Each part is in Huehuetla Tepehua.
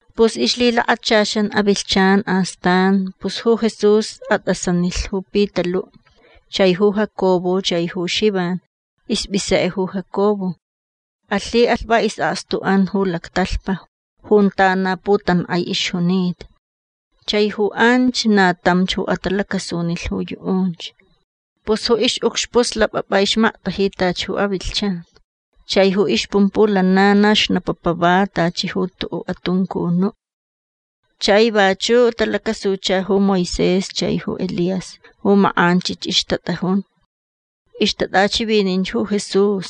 Pus ixlhilakachaxan avilhchan astan pus ju Jesús atʼasanilh ju Pitaluʼ chai ju Jacobo chai ju Xivan. Ispʼisekʼe ju Jacobo. Alhiʼalh va isʼakstuʼan ju lactalhpa junta na putankʼai ixjunita. Chai ju anch na tamch ju atalacasunilh ju yuʼunch. Pus ju ixʼucxpuʼ slapʼapʼa ixmaktaji tachi ju avilhchan. Chai ju ixpumpuʼ lana na xnapapa va tachi ju tuʼuʼ atuncunuʼ. Chai vachuʼ talacasucha ju Moisés chai ju Elías ju makʼanchich ixtatʼajun. Ixtatʼachivininch ju Jesús.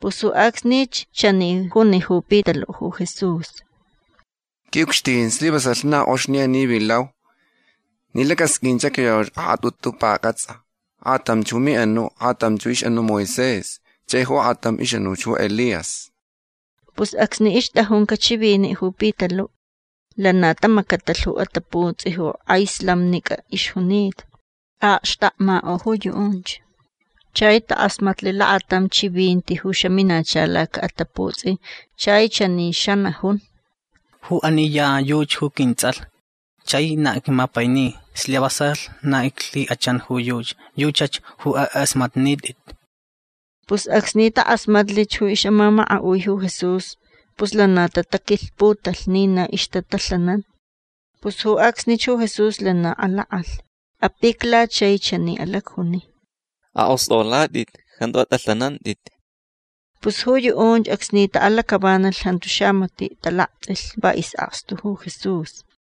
Pus ju acsnich chani juni ju Pitaluʼ ju Jesús: ―Quiʼucxtin slivasalh na kʼox ni ani vilau. Ni lacʼasqʼuinch acyoyau akʼatʼutu pacʼatsʼa. Akʼatam ju miʼanuʼ. Akʼatam ixʼanu ju Moisés. Chai ju akʼatam ixʼanuʼ ju Elías. Pus acsni ixtʼajuncaʼ chiviniʼ ju Pitaluʼ lana tamacatalh ju ataputsʼi ju kʼai slamnicʼa ixjunita. Aʼakxtakmakʼo ju yuʼunch. Chai takʼasmatlh lakatam chivinti ju xaminacha lacaʼataputsʼi chai chani xanajun: ―Ju ani ya yuchi ju quintsʼalh chai na icmapaini. Slivasalh na iclhikʼachan ju yuchi. Yuchach ju akʼasmatnitʼit. Pus acsni takʼasmatlich ju ixʼamamakaʼui ju Jesús pus lana tataquilhputalh ni na ixtatalhanan. Pus ju acsnich ju Jesús lana alakʼalh. Apicla chai chani alacjuni: ―Akʼostʼolatʼit. Jantu atʼalhanantʼit. Pus ju yuʼunch acsni taʼalacʼavanalh jantu xamatiʼ talaktsʼilh. Va isʼakstu ju Jesús.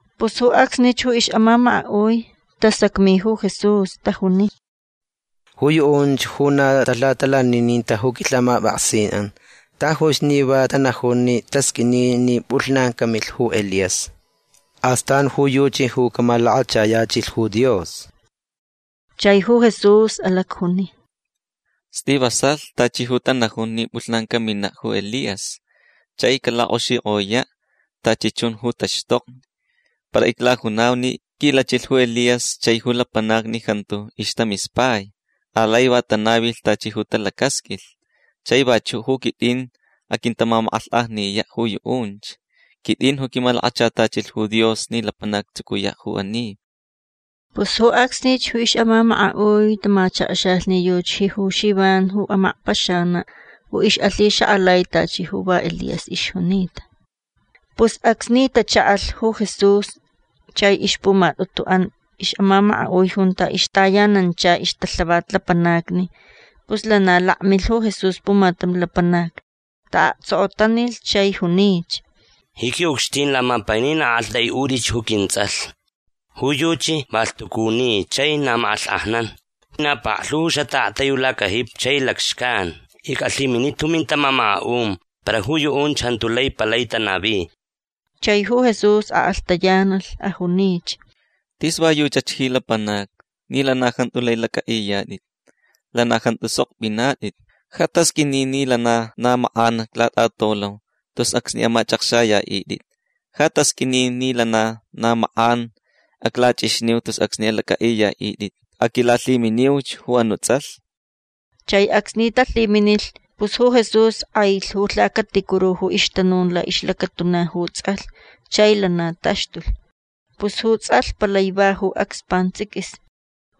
Pus ju acsnich ju ixʼamamakaʼui tasacmi ju Jesús. Tajuni: ―Ju yuʼunch ju na talhatalanininta ju quilhamapʼaksinʼan tajuch ni va tanajun ni tasqʼuini ni pʼulhnan camilh ju Elías. Astan ju yuchi ju camalakachayachilh ju Dios. Chai ju Jesús alacjuni: ―Slivasalh tachi ju tanajun ni pʼulhnan caminaʼ ju Elías chai calakʼoxikʼoyaʼ tachi chun ju taxtokni. Para iclajunau ni quilachilh ju Elías chai ju lapanacni jantu ixtamispai. Alai va tanavilh tachi ju talacasqʼuilh. Chai vachuʼ ju quitʼin aquintamamakʼalhkʼajniyaʼ ju yuʼunch. Quitʼin ju quimalakachatachilh ju Dios ni lapanac actsucuyaʼ ju ani. Pus ju acsnich ju ixʼamamakaʼui tamachakxalh ni yuchi ju Xivan ju amakpaxanaʼ ju ixʼalhixakʼalai tachi ju va Elías ixjunita. Pus acsni tachaʼalh ju Jesús chai ixpumatʼutuʼan ixʼamamakaʼui junta ixtayanancha ixtalhavat lapanacni pus lana lakmilh ju Jesús pumatam lapanac. Taʼaktsokotanilh chai junich: ―Ji quiʼucxtin lamapainin aʼaktʼaiʼutʼich ju quintsʼalh. Ju yuchi va lhtucuni chai na makʼalhkʼajnan. Na paklhu ju xataʼaktai ju lacajipi chai lacxcan. Icʼalhiminita ju mintamamakaʼun para ju yuʼunch jantu lai palai tanavi. Chai ju Jesús akʼalhtayanalh. Ajunich: ―Tis va yuchach ji lapanacni ni lana jantu lai lacʼaʼiyatʼit. Lana jantu sok pʼinatʼit. Ja tasqʼuini ni lana na makʼan aclatʼatolau tus acsni amachʼakxayaʼitʼit. Ja tasqʼuini ni lana na makʼan aclachʼixniu tus acsni alacʼaʼiyaʼitʼit. Aquilalhiminiuch ju anuʼ tsʼalh. Chai acsni talhiminilh pus ju Jesús kʼailh ju lhacaticuru ju ixtanun laʼixlacatuna ju tsʼalh chai lana taxtulh. Pus ju tsʼalh palai va ju acs pantsʼiquis.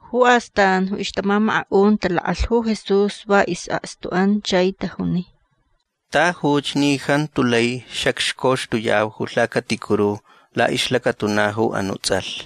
Ju astan ju ixtamamakaʼun talakʼalh ju Jesús va isʼakstuʼan chai tajuni: ―Tajuch ni jantu lai xacxcoxtuyau ju lhacaticuru laʼixlacatuna ju anuʼ tsʼalh.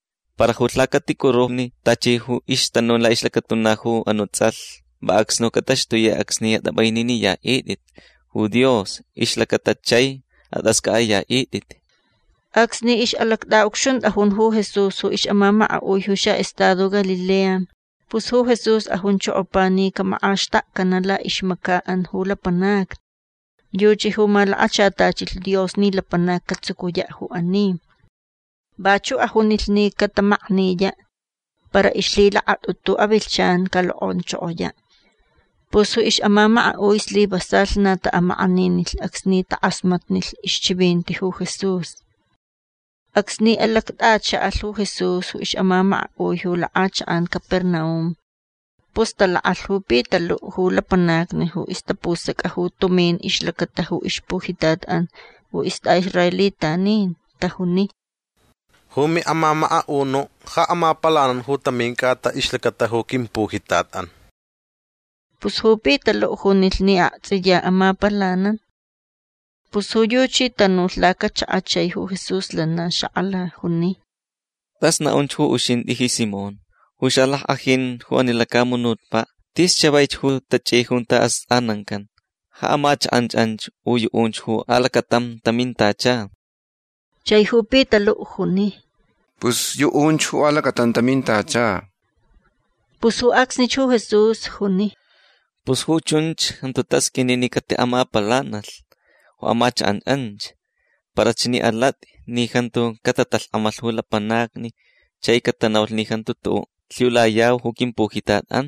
Para ju lhacaticurulhni tachi ju ixtanun laʼixlacatuna ju anuʼ tsʼalh va acsni ju catataxtuyaʼ acsni atʼapʼaininiyaʼitʼit ju Dios ju ixlacata chai atʼascʼaʼayaʼitʼit. Acsni ixʼalactʼaʼucxuntʼajun ju Jesús ju ixʼamamakaʼui ju xaʼestado Galilea pus ju Jesús ajunchokopa ni camakʼaxtakcanaʼ laʼixmacaʼan ju lapanacni. Yuchi ju malakachatachilh Dios ni lapanac catsucuyaʼ ju ani. Vachuʼ ajunilh ni catamakniyaʼ para ixlhilakatʼutu avilhchan calokʼonchokoyaʼ. Pus ju ixʼamamakaʼui slivasalh na taʼamakʼaninilh acsni takʼasmatnilh ixchivinti ju Jesús. Acsni alactʼachaʼalh ju Jesús ju ixʼamamakaʼui ju lakʼachakʼan Capernaum pus talakʼalh ju Pitaluʼ ju lapanacni ju ixtapusacʼa ju tumin ixlacata ju ixpujitatʼan ju istʼaʼisraelitanin. Tajuni: ―Ju miʼamamakaʼunuʼ ja amapalanan ju tamin cʼata ixlacata ju quimpujitatʼan. Pus ju Pitaluʼ junilh ni aktsʼiya amapalanan. Pus ju yuchi tanulh lacachakaʼ chai ju Jesús lana xakʼala. Juni: ―Tʼas naʼunch ju uxintʼi ji Simón. Ju xalackʼajin ju ani lacamunutpaʼ tis chavaich ju tachʼi junta astʼanancan. Ja amachakʼan anch u yuʼunch ju alacatam tamintacha. Chai ju Pitaluʼ juni: ―Pus yuʼunch ju alacatam tamintacha. Pus ju acsnich ju Jesús juni: ―Pus ju chunch jantu tasqʼuini ni catiʼamapalanalh ju amachakʼan anch. Para chani alatʼi ni jantu catatalhkʼamalh ju lapanacni chai catanaulh ni jantu tuʼuʼ lhiulayau ju quimpujitatʼan.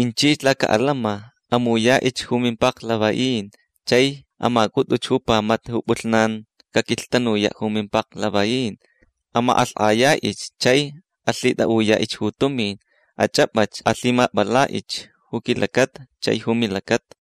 Inchich lacaʼatantsʼin. Amuyaʼich ju mimpaklavaʼin. Chai amacʼutʼuch ju pamata ju pʼulhnan caquilhtanuyaʼ ju mimpaklavaʼin. Amakʼalhkʼayaʼich chai alhitʼaʼuyaʼich ju tumin. Achʼapʼach. Alhimapʼalaʼich ju quilacata chai ju milacata.